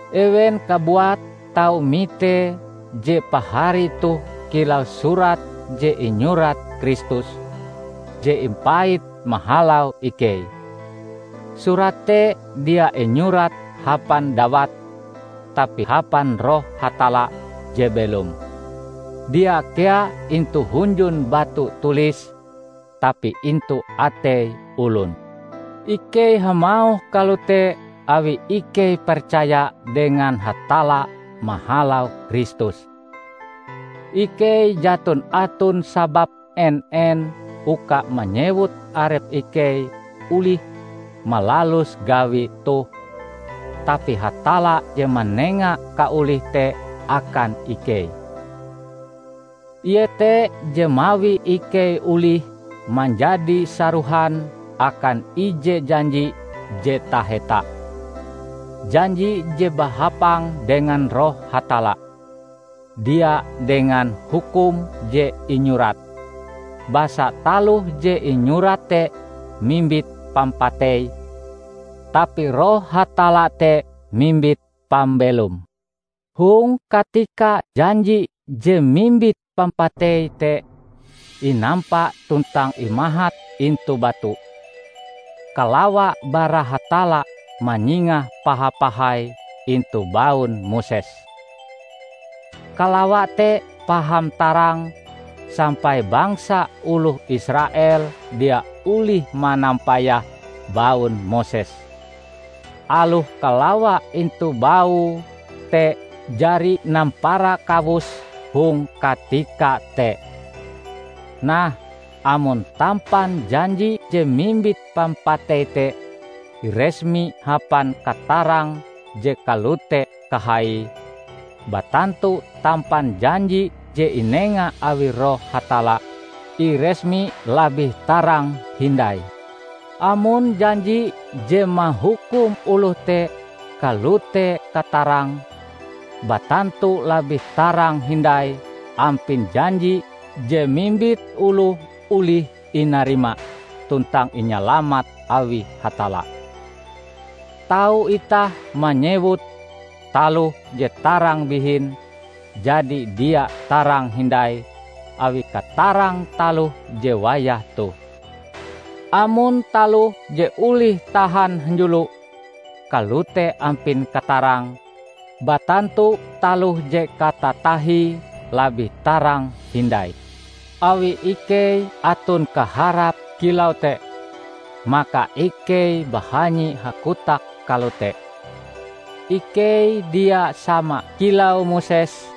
Ewen kabuat tau mitee je pahari toh kilau surat je inyurat Kristus, je impait mahalau ikei. Surat te dia inyurat hapan dawat, tapi hapan Roh Hatalla je belom; dia kea intu hunjun batu tulis, tapi intu atei olon. Ikei hamauh kalote awi ikei percaya dengan Hatalla mahalau Kristus. Ikei jaton aton sabab en-en uka manyewut arep ikei olih malalus gawi toh, tapi Hatalla je manenga kaolih te akan ikei. Ie te je mawi ikei olih manjadi sarohan akan ije janji je taheta; janji je bahapang dengan Roh Hatalla, dia dengan hukum je inyurat. Basa taloh je inyurat te mimbit pampatei, tapi Roh Hatalla te mimbit pambelom. Hong katika janji je mimbit pampatei te inampa tuntang imahat intu batu, kalawa bara Hatalla manyingah paha-pahai intu baun Moses. Kalawa te paham tarang sampai bangsa oloh Israel dia olih manampayah baun Moses, aloh kalawa intu baue te jari nampara kawus hong katika te. Nah, amon tampan janji je mimbit pampatei te iresmi hapan katarang je kalote kahaie, batantu tampan janji je inenga awi Roh Hatalla, iresmi labih tarang hindai. Amon janji je mahukum oloh te kalote katarange, batantu labih tarang hindai ampin janji je mimbit oloh olih inarima tuntang inyalamat awi Hatalla. Tau itah manyewute, taloh je tarang bihin, jadi dia tarang hindai awi katarang taloh je wayah toh. Amon taloh je olih tahan hanjulo, kalote ampin katarange, batantu taloh je katatahie labih tarang hindai. Awi ikei aton kaharap kilau te, maka ikei bahanyi hakotak kalote. Ikei dia sama kilau Moses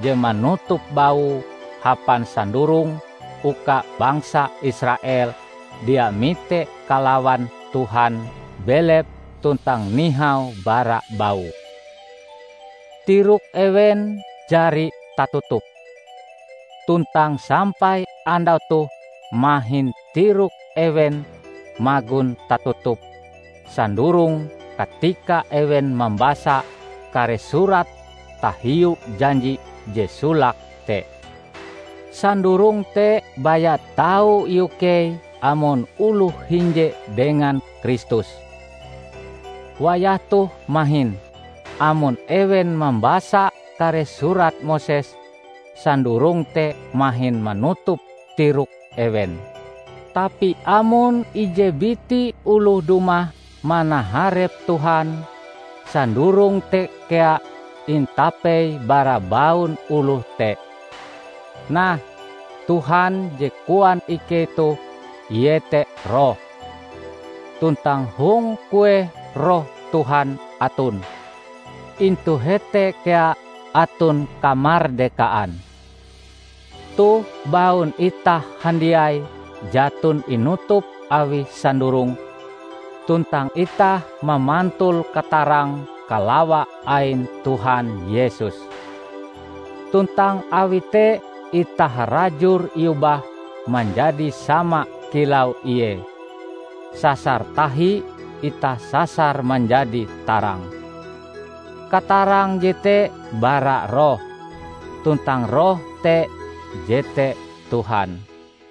je manutup baue hapan sandurong uka bangsa Israel dia mite kalawan Tuhan belep tuntang nihau bara baue. Tirok ewen jari tatutup. Tuntang sampai andau toh mahin tirok ewen magon tatutup sandurong katika ewen mambasa kare surat tahiu janji je solake te. Sandurong te baya tau iukei amon oloh hinje dengan Kristus. Wayah toh mahin, amon ewen mambasa kare surat Moses, sandurong te mahin manutup tirok ewen. Tapi amon ije biti oloh dumah manaharep Tuhan, sandurong te kea intapei bara baun oloh te. Nah, Tuhan je koan ikei toh iete Roh. Tuntang hong kueh Roh Tuhan aton, intu hete kea aton kamardekaan. Toh baun itah handiai jaton inutup awi sandurong, tuntang itah mamantul katarang kalawa ain Tuhan Yesus. Tuntang awi te itah harajur iobah manjadi sama kilau ie; sasar tahi itah sasar manjadi tarang. Katarang jete bara Roh, tuntang Roh te jete Tuhan.